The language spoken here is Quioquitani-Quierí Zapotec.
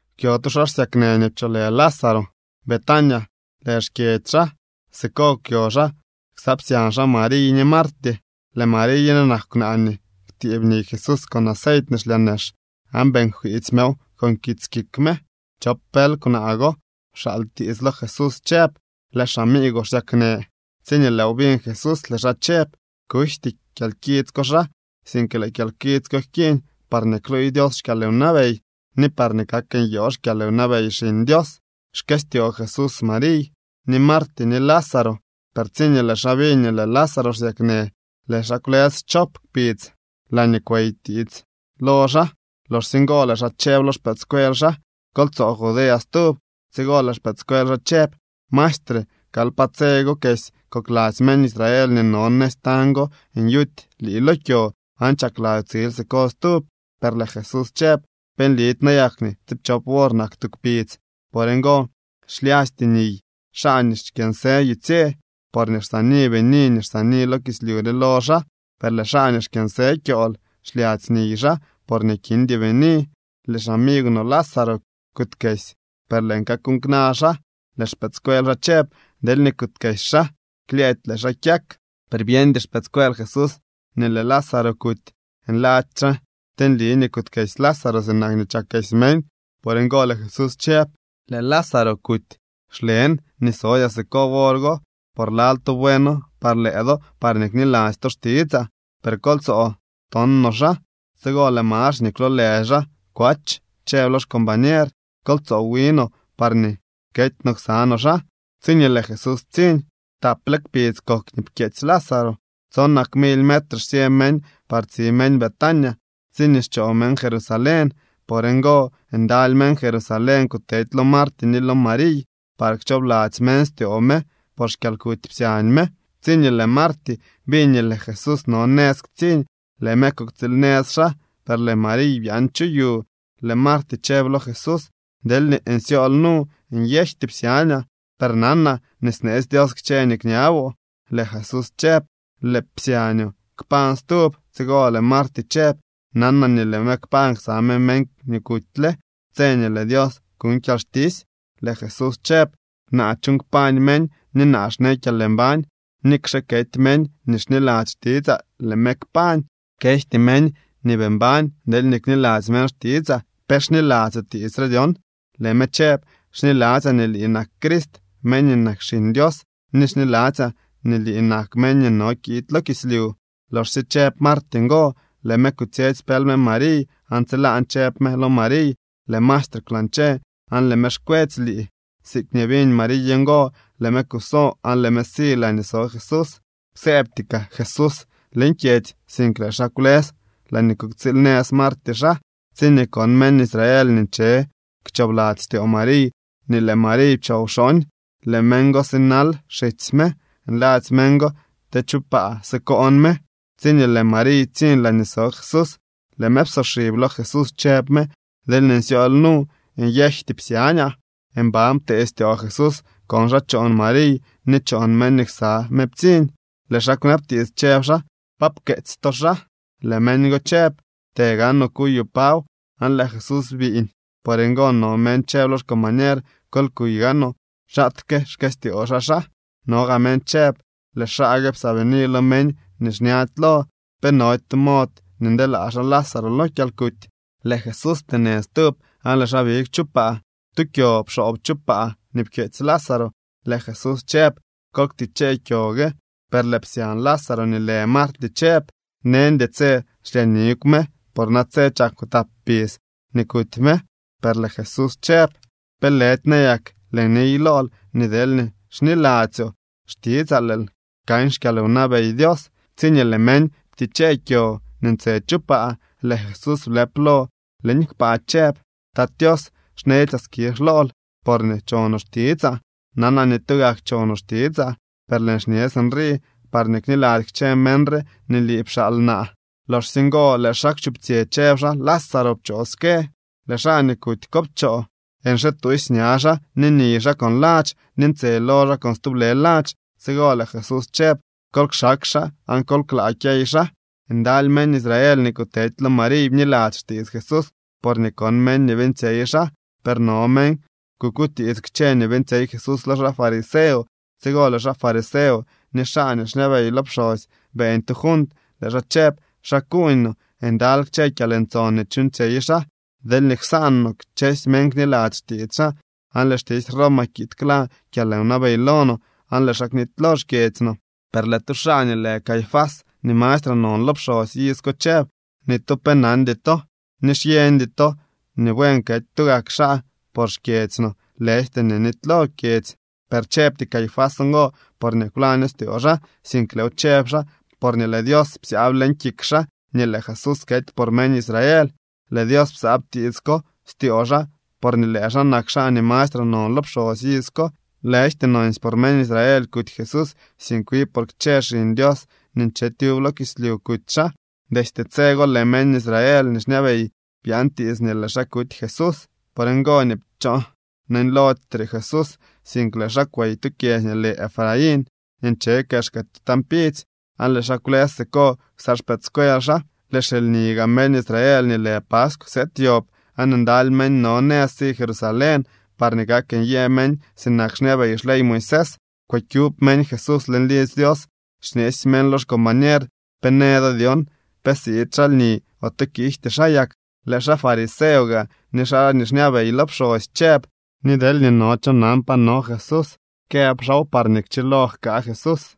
Kwyo tu xaa xsyaknë nii pcholë Lázaro. Betania lë xkyedzy xaa. Siko kwyo xaa ksa psyañ xaa Mariy ni Marty. Lëë Mariy re nak kwnaa nii kwtiib niy Jesús con aceit nii xlyaa nex aan beeñ jkwiitsy mew con kits kik me. Chop pël kwnaa go pxaal tiits lo Jesús chëb: —Lëë xamiigwoo xsyaknë. Tsiñee lëëw biñ Jesús, lëë xaa chëb: —Kujty kyalkits ko xaa, sink lëë kyalkits ko jkiiñ parñee kluuy Dios xkyalwnabey ni parñee kak nyoo xkyalwnabey Xiñ Dios. Xkëstyoo Jesús Mariy, ni Marty ni Lázaro, per tsiñee lëë xaa biñ nii lëë Lázaro xsyaknë, lëë xaa kwlës schop kpidz laañee kwey tiits lo xaa. Loxsye ngo lëë xaa chëb lo xpëëdscuel xaa: —Kol tsoo Judea stub. Tsigo lëë xpëëdscuel xaa chëb: —Maestre, kal pa tse go kesy kokladzy meñ Israel nii no nëz tañ go nyuty lii lo kyo, ¿aan chakladzyoo tsil siko stub? Per lëë Jesús chëb: —¿Pe nlidy nayak nii tsiipchop wor nak tu kpidz? Por ngo xlyasty niy xaa nii xkyënsë yutsye, porñee xsaani bini nii xsaani lo kislyu re lo xaa. Per lëë xaa nii xkyënsë kyool xlyadzy niy xaa porñee kindy bini. Lëë xamigw no Lázaro kuutkesy, per lëën kakuuñ kna xaa. Lëë xpëëdscuel xaa chëb: —Deelñee kuutkesy xaa, klyëëdy lëë xaa kyak. Per byeñdy xpëëdscuel Jesús nii lëë Lázaro kuty. Nladzy xaa te nli nii kuutkesy Lázaro sinak nii chakesy meñ. Por ngo lëë Jesús chëb: —Lëë Lázaro kuty. Xlen nii sodyaa siko wor go, por lal tu bueno par lëë do parñee kniladzy to xtitsaa. Per kol tso ton no xaa. Tsigo lëë Max nii kwloolë xaa Kwach chëb lo xcombañer: —Kol tsoo wi no parñee kety no ksa no xaa. Tsiñee lëë Jesús ptsiñ, taple kpidz kok nii pkyeetsy Lázaro. Tsonak mily metre xsyë meñ par tsi meñ Betania tsiñee xchoo meñ Jerusalén. Por ngo ndaly meñ Jerusalén kutedy lo Marty ni lo Mariy par kchoobladzy meñ styoo me por xkyalkuty psyañ me. Tsiñee lëë Marty biñ nii lëë Jesús no nëz ktsiñ, lëë me kuktsiil nëz xaa, per lëë Mariy byaan chu yu. Lëë Marty chëb lo Jesús: —Deelñee nsyool nu, nyejty psyañaa. Per nanaa nii sneetsy Dios kchë nii kñaboo. Lëë Jesús chëb: —Lëë psyañoo kpañ stub. Tsigo lëë Marty chëb: —Nanaa nii lëë me kpañ ksa me meñ nii kutyle tse nii lëë Dios kuñ kyalxtisy. Lëë Jesús chëb: —Naa chuuñ kpañ meñ ni naa xnee kyalmbañ. Nikxe kety meñ nii xniladzy xtitsaa, lëë me kpañ. Kejty meñ nii bii mbañ deelñee kniladzy meñ xtitsaa. ¿Pe xniladzyoo tiits re dyon? Lëë me chëb: —Xniladzyaa nii lii nak Crist, meñ nii nak Xiñ Dios, ni xniladzyaa nii lii nak meñ nii no kiid lo kislyu. Loxsye chëb Marty ngo, lëë me kutsyetsy pël me Mariy, aan tsilaan chëb me lo Mariy: —Lëë maestre kwlañche aan lëë me xkwetsy lii. Siikñee biñ Mariy ngo, lëë me kuso aan lëë me si laañee so Jesús. Kwsëëbty kaa Jesús leñ kyedzy, sink lëë xaa kwlës laañee kuktsiil nëz Marty xaa. Tsiñee kon meñ Israel nii nche kchoobladzy styoo Mariy nii lëë Mariy pchoo wxooñ, lëë meñ go sinal xitsy me nladzy meñ go te chu paa sikoon me. Tsiñee lëë Mariy ptsiñ laañee so Jesús, lëë me psoxib lo Jesús, chëb me: —Deelñee nsyool nu, nyejty psyañaa. Mban ptee styoo Jesús kon xaa choon Mariy ni choon meñ nii ksa me ptsiñ. Lëë xaa kwnabtiits, chëb xaa: —¿Pa pkeetsy to xaa? Lëë meñ go chëb: —Të gaanoo kuyoo paw. Aan lëë Jesús biiñ. Por ngo no meñ chëb lo xcombañer: —Kol kuy gaanoo xaatke xkëstyoo xaa xaa. No gaa meñ chëb: —Lëë xaa gue psaabini lo meñ nii xñady lo. ¿Pe nody tu mod nii ndeelaa xaa Lázaro lo kyalkuty? Lëë Jesús pteenë stub, aan lëë xaa big chu paa. Tu kyo pxoob chu paa nii pkyeetsy Lázaro. Lëë Jesús chëb: —Kol ktichee kyo gue. Per lëë psyañ Lázaro nii lë Marty chëb: —Neñdy tse xlyaa nigw me, por natse chak tap kpidz nii kuty me. Per lëë Jesús chëb: —¿Pe lëdy nayak lëën niy lool nii deelñee xniladzyoo xtitsaa, lëël kan xkyalwnabey Dios? Tsiñee lëë meñ ptichee kyo nii ntse chu paa, lëë Jesús blëp lo leñ kpaa chëb: —Tat Tios, xnetsyaa skizh lool porñee chonoo xtitsaa. Nanaa nii tugak chonoo xtitsaa, per lëën xñe sinrii parñee kniladzy kchë meñ re nii lii pxaal naa. Loxsye ngo lëë xaa kwchuptsyë, chëb xaa: —¡Lázaro, pchoo ske! Lëë xaa nii kuty ko pchoo, nxituusy ña xaa ni niy xaa con ladx ni ntse lo xaa con stublë ladx. Tsigo lëë Jesús chëb: —Kol kxaak xaa, aan kol klaa kyey xaa. Ndaly meñ Israel nii kutedy lo Mariy bniladzy xtiits Jesús porñee kon meñ nii beeñtsyey xaa. Per no meñ kukutiits kchë nii beeñtsyey Jesús lo xaa fariseo. Tsigo lëë xaa fariseo ni xaa nii xñabey lo pxosy beeñ tu junt. Lëë xaa chëb: —¿Xa kuuñ no? Ndaly kchë kyalntson nii chuuñtsyey xaa. Deelñee ksaan no, kchësy meñ kniladzy xtiits xaa, aan lëë xtisy Roma kiid kla kyalwnabey lo no aan lëë xaa knitylo xkyedzy no. Per lëë tu xaa nii lë Caifás nii mastre non lo pxosy iz ko chëb: —Ni tu pe nandy to, ni xyeñdy to nii buen kety tugak xaa por xkyedzy no, lëjty nii nitylo kyedzy. Per chëbty Caifás ngo porñee kwlaño styoo xaa, sink lëëw chëb xaa porñee lëë Dios psyaab leñ kik xaa nii lëë Jesús kety por meñ Israel. Lëë Dios psyaab tiits ko styoo xaa porñee lëë xaa nak xaa nii mastre non lo pxosy iz ko. Lëjty nonsy por meñ Israel kuty Jesús, sink wi por kchë xiñ Dios nii nche tyub lo kislyu kuty xaa. Destye tse go lëë meñ Israel nii xñabey byaan tiits nii lëë xaa kuty Jesús. Por ngo nii pchoo neñlody re Jesús, sink lëë xaa kwey tu kyedzy nii lë Efraín nii nche kexka tu tañ pidzy. Aan lëë xaa kwlës siko ksa xpëëdscuel xaa. Lëë xilni gaa meñ Israel nii lë paskw sëëd yob, aan ndaly meñ no nëz si Jerusalén parñee kak nyë meñ sinak xñabey xley Moisés. Kwëkyub meñ Jesús leñ lidzy Dios, xñeesy meñ lo xcombañer: —¿Pe në do dyon? ¿Pe siid xaa lni ote kiijty xaa yak? Lëë xaa fariseo gaa ni xaa nii xñabey lo pxosy chëb nii deelñee no cho nan pa no Jesús, këb xaaw parñee kchilo jkaa Jesús.